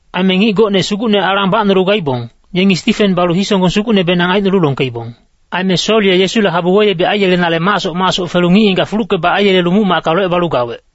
Aime ngic gocne Sugucne alang bacnolu gaibong, yengi Stifen balu hisonggong sugucnebenang aicnolu longkeibong. Aime Sol ye Yesule habu weyebic aiyelenale macsoc macsoc felu ngic-ngigac fulucke-bac aiyelelu muc-macka locebalu gawec.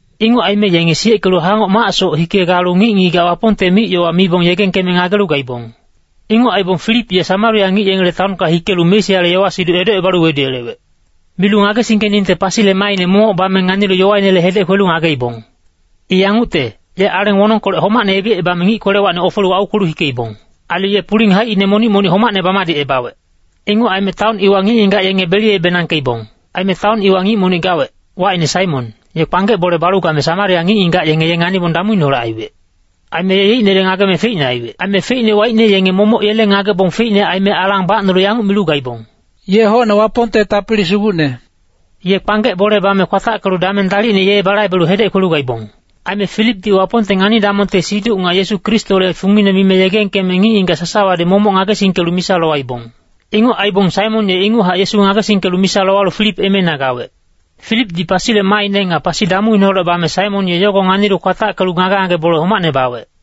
Inguc aime yenge siyeckelu hangoc macsoc hike galu ngic-ngigac Wapongte mic-yowa mibong yegengkeme ngagelu gaibong. Inguc aibong Filip ye Samaria ngic yengele taonka hikelu Mesiale yowa-siduc edocebalu weduyelewec. Milu ngagesingkeningte pasile maaine momoc bame nganilu yowainele hedec kwelu ngageibong. I yangucte, ye aleng wonongkolec homacne yebicebame ngic kwelewacni ofelu aukwelu hikeibong. Ailu ye puling haicine monic-monic homacne bamadicebawec. Inguc aime taon iwa ngic-ngigac yenge beliyebenangkeibong. Aime taon iwa ngic monic gawec, wacine Saimon, ye kpanggec bole balu game Samaria ngic-ngigac yenge ye nganibong damuineholec aiwec. Aime ye yeicnele ngageme feicne aiwec. Aime feicne waicne yenge momoc yele ngagebong feicne aime alang bacnolu yanguc milu gaibong, “Ye hocne Wapongte tapili sugucne.” Ye kpanggec bole bame kwatackelu dameng dalicne ye balaibelu hedec kwelu gaibong. Aime Filipdi Wapongte ngani-damongte siduc nga Yesu Kristole fungine mime yegengkeme ngic-ngigac sasawadi momoc ngagesingkelu misa lowaibong. Inguc aibong Saimon ye inguchac Yesu ngagesingkelu misa lowalu Filip emeina gawec. Filipdi pasile maaine nga pasi damuineholec bame Saimon ye yogo nganilu kwatackelu ngage-ngage bole homacne bawec.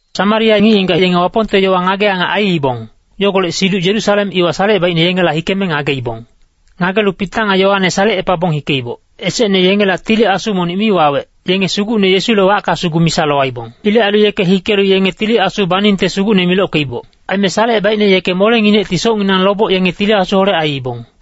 Samaria ngic-ngigac yenge Wapongte yowa ngage-angac aiibong, yogolec siduc Yerusalem iwa salecebaicne yengela hikeme ngageibong. Ngagelu Pita nga Yoane salecepabong hikeiboc. Esecne yengela Tili Asu monic mi wawec, yenge Sugucne Yesule wacka sugu misa lowaibong. Ilec ailu yeke hikelu yenge Tili Asu baningte Sugucne milockeiboc. Aime salecebaicne yeke molenginecti socnginang loboc yenge Tili Asuholec aiibong.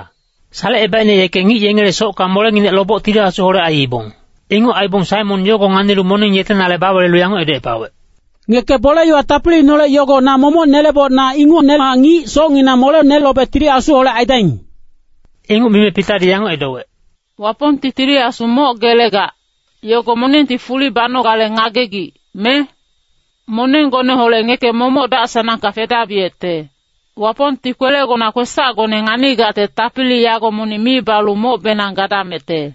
Salecebaicne yeke ngic yengele socka molenginec loboc Tili Asuholec aiibong. Inguc aibong Saimon yogo nganilu moneng yetenale bawelelu yanguc edocepawec, “Ngeke bole-yowa tapiliineholec yogo na momoc neleboc na ingucnehac ngic socnginang molene lobe Tili Asuholec aidaing.” Inguc mime Pitadi yanguc edowec, “Wapongti Tili Asu moc gelegac, yogo monengti fuli banogale ngagegic, me? Monenggoneholec ngeke momoc dac-sanangka fedabiyecte! Wapongti kwelegona kwesacgone nganigacte tapili yago monic mi balu mocbenang gadamecte.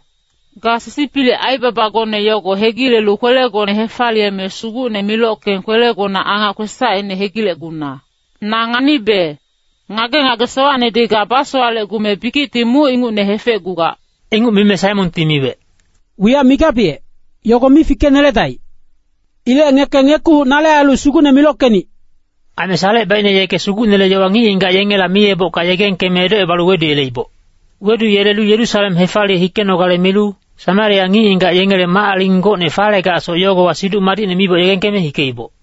Ga sisipilic aibabagone yogo hegilelu kwelegone hefaliyeme Sugucne milockeng kwelegona angac kwesacine hegilecguna. Na nganibe, ngage-ngage sowacnedi ga basowalecgume bikicti muc ingucne hefecgugac.” Inguc mime Saimonti miwec, “Wiyac migabiyec, yogo mi fikeneledaic. Ilec ngeke ngekuhuc nale ailu Sugucne milockenic.” Aime salecebaicne yeke Sugucnele yowa ngic-ngigac yengela miyebocka yegengkeme edocebalu weduyeleiboc. Weduyelelu Yerusalem hefaliye hikenogale milu, Samaria ngic-ngigac yengele mac-aling gocne falegacsoc yogowa Siduc Madicne miboc yegengkeme hikeiboc.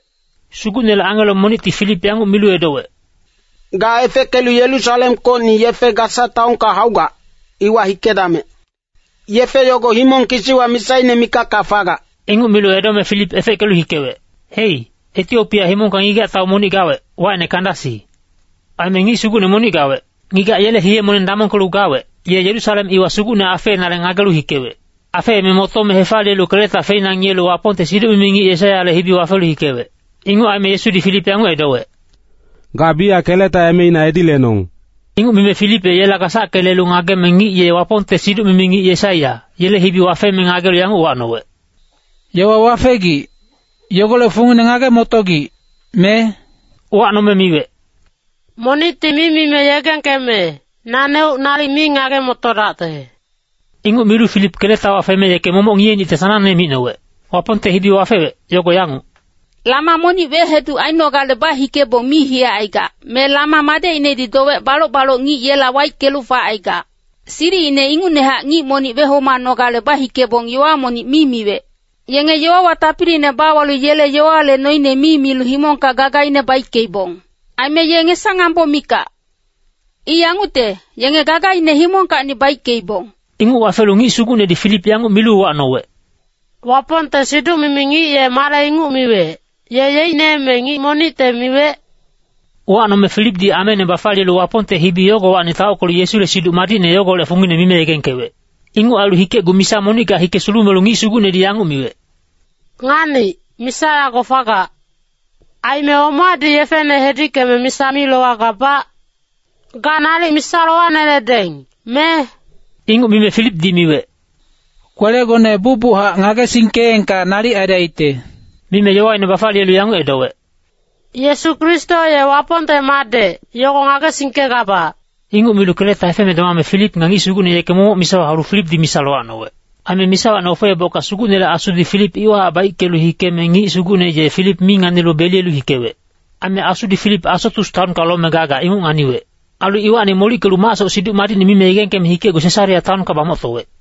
Sugucnele angelo monicti Filip yanguc milu edowec, “Ga efeckelu Yerusalemkocni yefe Gasa taonka haugac, iwa hikedamec. Yefe yogo himong kisiwa misaine mikacka fagac.” Inguc milu edome Filip efeckelu hikewec. Hei, Etiopia himongka ngigac-tau monic gawec, wacine Kandasi. Aime ngic sugucne monic gawec. Ngigac yele hiye-moneng damongkelu gawec, ye Yerusalem iwa Sugucne afeenale ngagelu hikewec. Afeeme motome hefaliyelu keleta feina ngiyelu Wapongte siduc-mimi ngic Yesaiyale hibi wafelu hikewec. Inguc aime Asudi Filip yanguc edowec, “Ga biyac keleta emeina edi lenong.” Inguc mime Filip ye yela gasacke lelu ngageme ngic ye Wapongte siduc-mimi ngic Yesaiya, yele hibi wafeme ngagelu yanguc uwacnowec, “Yowa wafegic, yogolec fungine ngage-motogic, me?” Uwacnome miwec, “Monicti mi mime yegengkeme, naneuc nalic mi ngage-motodacte.” Inguc milu Filip keletawa feme yeke momoc ngiyenicte sanangne micnowec. Wapongte hibi wafewec, yogo yanguc, “Lama monic weheduc ainogale bahikebong mi hiyacaigac, me lama madecinedi dowec baloc-baloc ngic yela waickelu facaigac. Silicine ingucnehac ngic monic wehomanogale bahikebong yowa monic mi miwec. Yenge yowawa tapiliine bawalu yele yowale noine mi milu himongka gagaine baickeibong. Aime ye ngesa-ngambo mikac. I yangucte, yenge gagaine himongkacni baickeibong.” Inguc wafelu ngic sugucnedi Filip yanguc milu uwacnowec, “Wapongte siduc-mimi ngic ye male inguc miwec, ye yeicne me ngic monicte miwec?” Uwacnome Filipdi ameine bafaliyelu Wapongte hibi yogowacni taockelu Yesule Siduc Madicne yogolec fungine mime yegengkewec. Inguc ailu hikecgu misa monicka hike sulumelu ngic sugucnedi yanguc miwec, “Nganic, misa yago fagac. Aime omadi yefene hedickeme misa mi lowagabac? Ga nalic misa lowaneledeng, me?” [Inguc mime Filipdi miwec, “Kwelegone bucbuchac ngagesingkeengka nalic aidacte.” Mime yowaine bafaliyelu yanguc edowec, “Yesu Kristo ye Wapongte madec, yogo ngagesingkegabac.”] Inguc milu keleta hefeme domame Filip nga ngic sugucne yeke momoc misawa haulu Filipdi misa lowacnowec. Aime misawacni ofeebocka Sugucnele Asudi Filip iwahac baickelu hikeme ngic sugucne ye Filip mi nganilu beliyelu hikewec. Aime Asudi Filip Asotus taonka lome gagac inguc nganiwec. Ailu iwacni molickelu macsoc Siduc Madicne mime yegengkeme hikecgu Sesarea taonka bamoctowec.